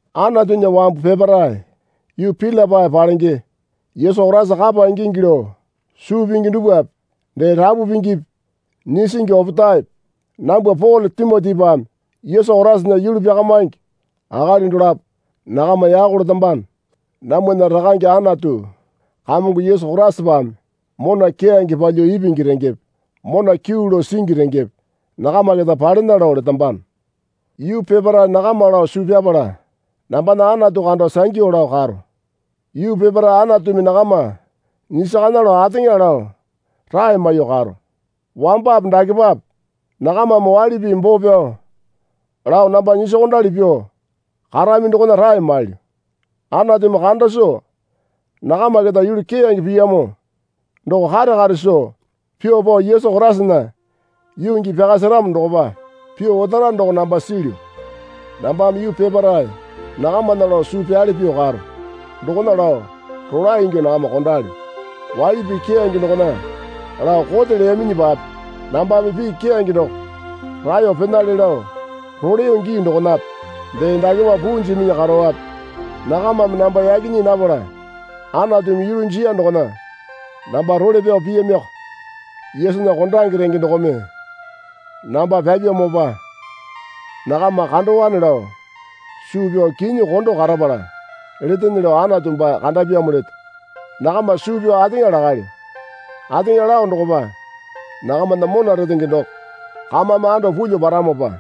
Anatunya wambu peparae yuu Pilipai palenge Yesu Koraisa kapa ingingi lao suu pingi dupwape dee rapu pingipi nyisingi opetaepe nambwa Pole Timotipame Yesu Koraisana yulu pyakamingi akali dolapo nakama yako letambano. Namwana Rakange Anatu Kamongo Yesu Koraisapame mona keyange palyuo ipingi rengepe mona kyuu lao singi rengepe nakama keta palena lao letambano. Yuu peparae nakama lao suu pyapala nambana Anatu kando sangyu lao karo. Yuu peparae Anatumi nakama nyisakana lao ateŋa lao rae maiyuo karo. Wambape dakepape nakamame waili pii boo pyao lao namba nyisokondali pyuo karami dokona rae mailyu. Anatumi kanda soo nakama keta yulu keyange piyamo doko kare kare soo pyuo pao Yesu Koraisana yuu gii pyaka seramo dokopa pyuo otara doko namba silyu. Nambame yuu peparae nakamana lao suu pyale pyuo karo. Dokona lao rolae ingyuo nakama kondalyo. Waili pii keyange dokona lao kote leyaminyipape nambame pii keyange doko raeyo penale lao roleyo gii dokonape dee dakepa puu jiminyi karowape nakamame namba yaki nyii napala Anatumi yulu jiya dokona namba role pyao piyamioko. Yesunya kondange renge dokome namba pyapyamopa nakama kandowane lao suu pyao kinyi kondo karapala letene lao Anatu baa kandapyamo leto. Nakama suu pyao ateŋa lakalyo. Ateŋa lao dokopa nakamana mona retenge doko kamame ando pulyuo paramopa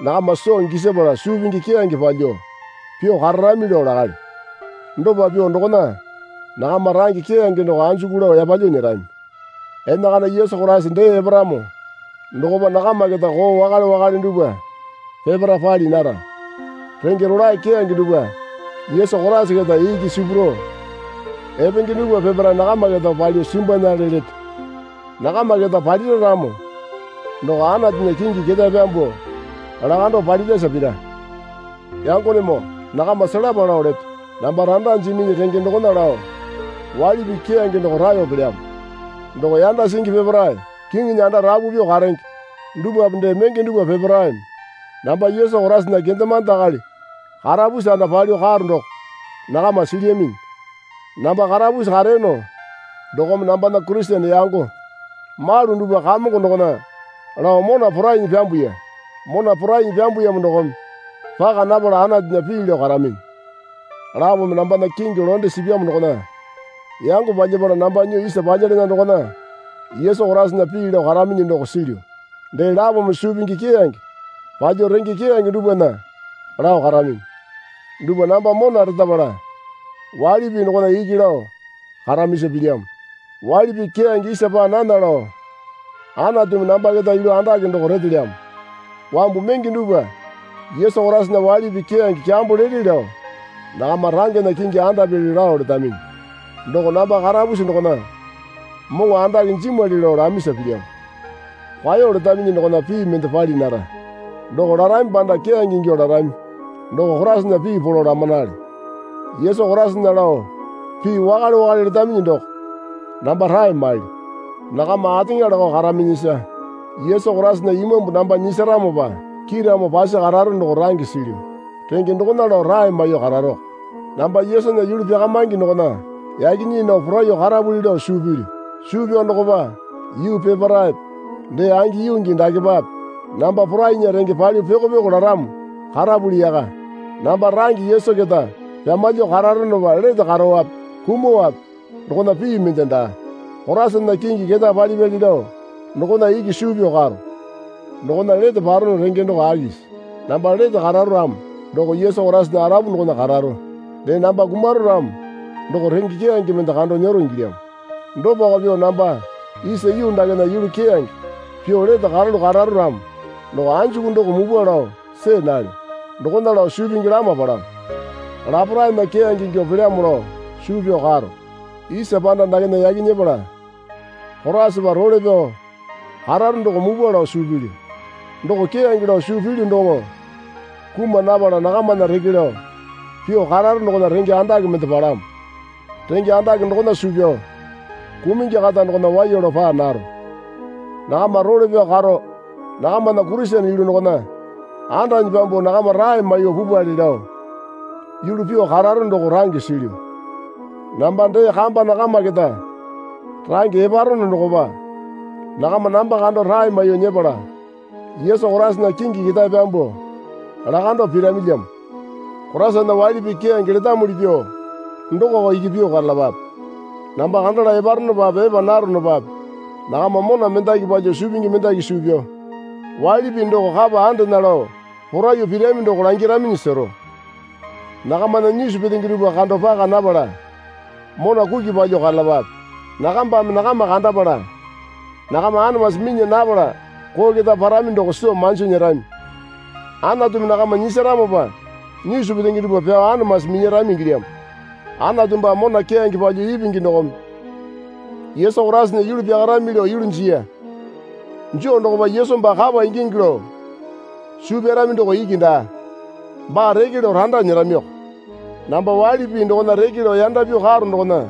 nakama soo gisapala suu pingi keyange palyuo pyuo kararami lao lakalyo. Dopa pyuo dokona nakama range keyange doko anjuku lao yapalyuo nyerami. Enakana Yesu Koraisa dee eparamo dokopa nakama keta koo wakale wakale dupwa peparae pali nara. Renge rolae keyange dupwa Yesu Koraisa keta iki sipurao epenge dupwa peparae nakama keta palyuo simbwanale leto. Nakama keta palira ramo doko Anatunya kingi ketae pyambuo lakando palirasa pira. Yangonemoo nakama selapa lao leto. Namba randa jiminyi renge dokona lao waili pii keyange doko raeyo pelyamo. Doko yanda singi peparae kiŋinya anda rapu pyuo karenge dupwape dee menge dupwa peparaeme namba Yesu Koraisana kendemande akali karapusi anda palyuo karo doko nakama silyaminyi. Namba karapusi kareyono dokome nambana Kurisene yango malu dupwa Kamongo dokona lao mona porainyi pyambuya. Mona porainyi pyambuyamo dokome paka napala Anatunya pii lao karaminyi. Lapome nambana kingi londe sipyamo dokona yango palyapala namba nyuo isa palyalana dokona Yesu Koraisana pii lao karaminyi doko silyu. Dee lapome suu pingi keyange palyuo renge keyange dupwana lao karaminyi. Dupwa namba mona retapala waili pii dokona iki lao karamisa pilyamo. Waili pii keyange isa paa nana lao Anatumi namba keta yulu andake doko retelyamo. Wambu menge dupwa Yesu Koraisana waili pii keyange kyambo lele lao nakama rangena kingi andapyali lao letaminyi. Doko namba karapusi dokona moŋo andake jimwali lao lamisa pilyamo. Kwao letaminyi dokona pii mende pali nara. Doko larami panda keyange ingyuo larami doko Koraisana pii polo lamanale. Yesu Koraisana lao pii wakale wakale letaminyi doko namba rae mailyu. Nakama ateŋa lakao karaminyisa Yesu Koraisana Imambu namba nyisaramopa kiiramo pasi kararo doko range silyu. Renge dokona lao rae maiyuo kararoko. Namba Yesunya yulu pyakamingi dokona yake nyii nao poraiyuo karapuli lao suu pilyu. Suu pyao dokopa yuu peparaepe dee angi yuu gii dakepape namba poraingi renge palyuo pyoko pyoko laramo karapuli yaka. Namba range Yesu keta pyamalyuo kararonopa lete kararope kumuowape dokona pii mende daa. Koraisana kingi ketae palipyali lao dokona iki suu pyao karo. Dokona lete parono renge doko akisi? Namba lete kararo ramo doko Yesu Koraisana arapu dokona kararo dee namba kumaro ramo doko renge keyange mende kando nyero ingilyamo. Dopako pyuo namba isa yuu dakena yulu keyange pyuo lete karalu kararo ramo doko anjuku doko mupwa lao see nalyo. Dokona lao suu pingi lama palamo. Laparaena keyange ingyuo pelyamo lao suu pyao karo. Isa panda dakena yaki nyepala Koraisapa role pyao kararo doko mupwa lao suu pilyu. Doko keyange lao suu pilyu doŋo kuma napala nakamana reke lao pyuo kararo dokona renge andake mende palamo. Renge andake dokona suu pyao kumungi kata dokona waiya lao paa naro. Nakama role pyao karo nakamana Kurisene yulu dokona andanyi pyambuo nakama rae maiyuo pupwale lao yulu pyuo kararo doko range silyu. Namba dee kamba nakama keta range eparono dokopa nakama namba kando rae maiyuo nyepala Yesu Koraisana kingi ketae pyambuo lakando piramilyamo. Koraisana waili pii keyange letamuli pyuo dokoko iki pyuo karalapape. Namba kandala eparonopape epa naronopape nakama mona mendaki palyuo suu pingi mendaki suu pyao waili pii doko kapa andena lao poraiyuo pirami doko langyaraminyi sero. Nakamana nyisu petenge dupwa kando paka napala mona kuki palyuo karalapape. Nakambame nakama kandapala nakama anamasi minya napala koo keta parami doko soo manji nyerami. Anatumi nakama nyisaramopa nyisu petenge dupwa pyuo anamasi minyarami ingilyamo. Anatu baa mona keyange palyuo ipingi dokome Yesu Koraisana yulu pyakarami lao yulu jiya. Joo dokopa Yesu baa kapa ingingi lao suu pyarami doko iki daa. Baa reke lao randa nyeramiko. Namba waili pii dokona reke lao yanda pyuo karo dokona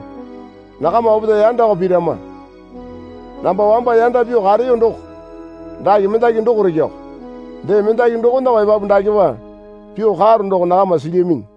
nakama opetae yandako pirama. Namba wamba yanda pyuo kareyo doko dake mendaki dokoreko. Dee mendaki dokonako epapu dakepa pyuo karo doko nakama silyaminyi.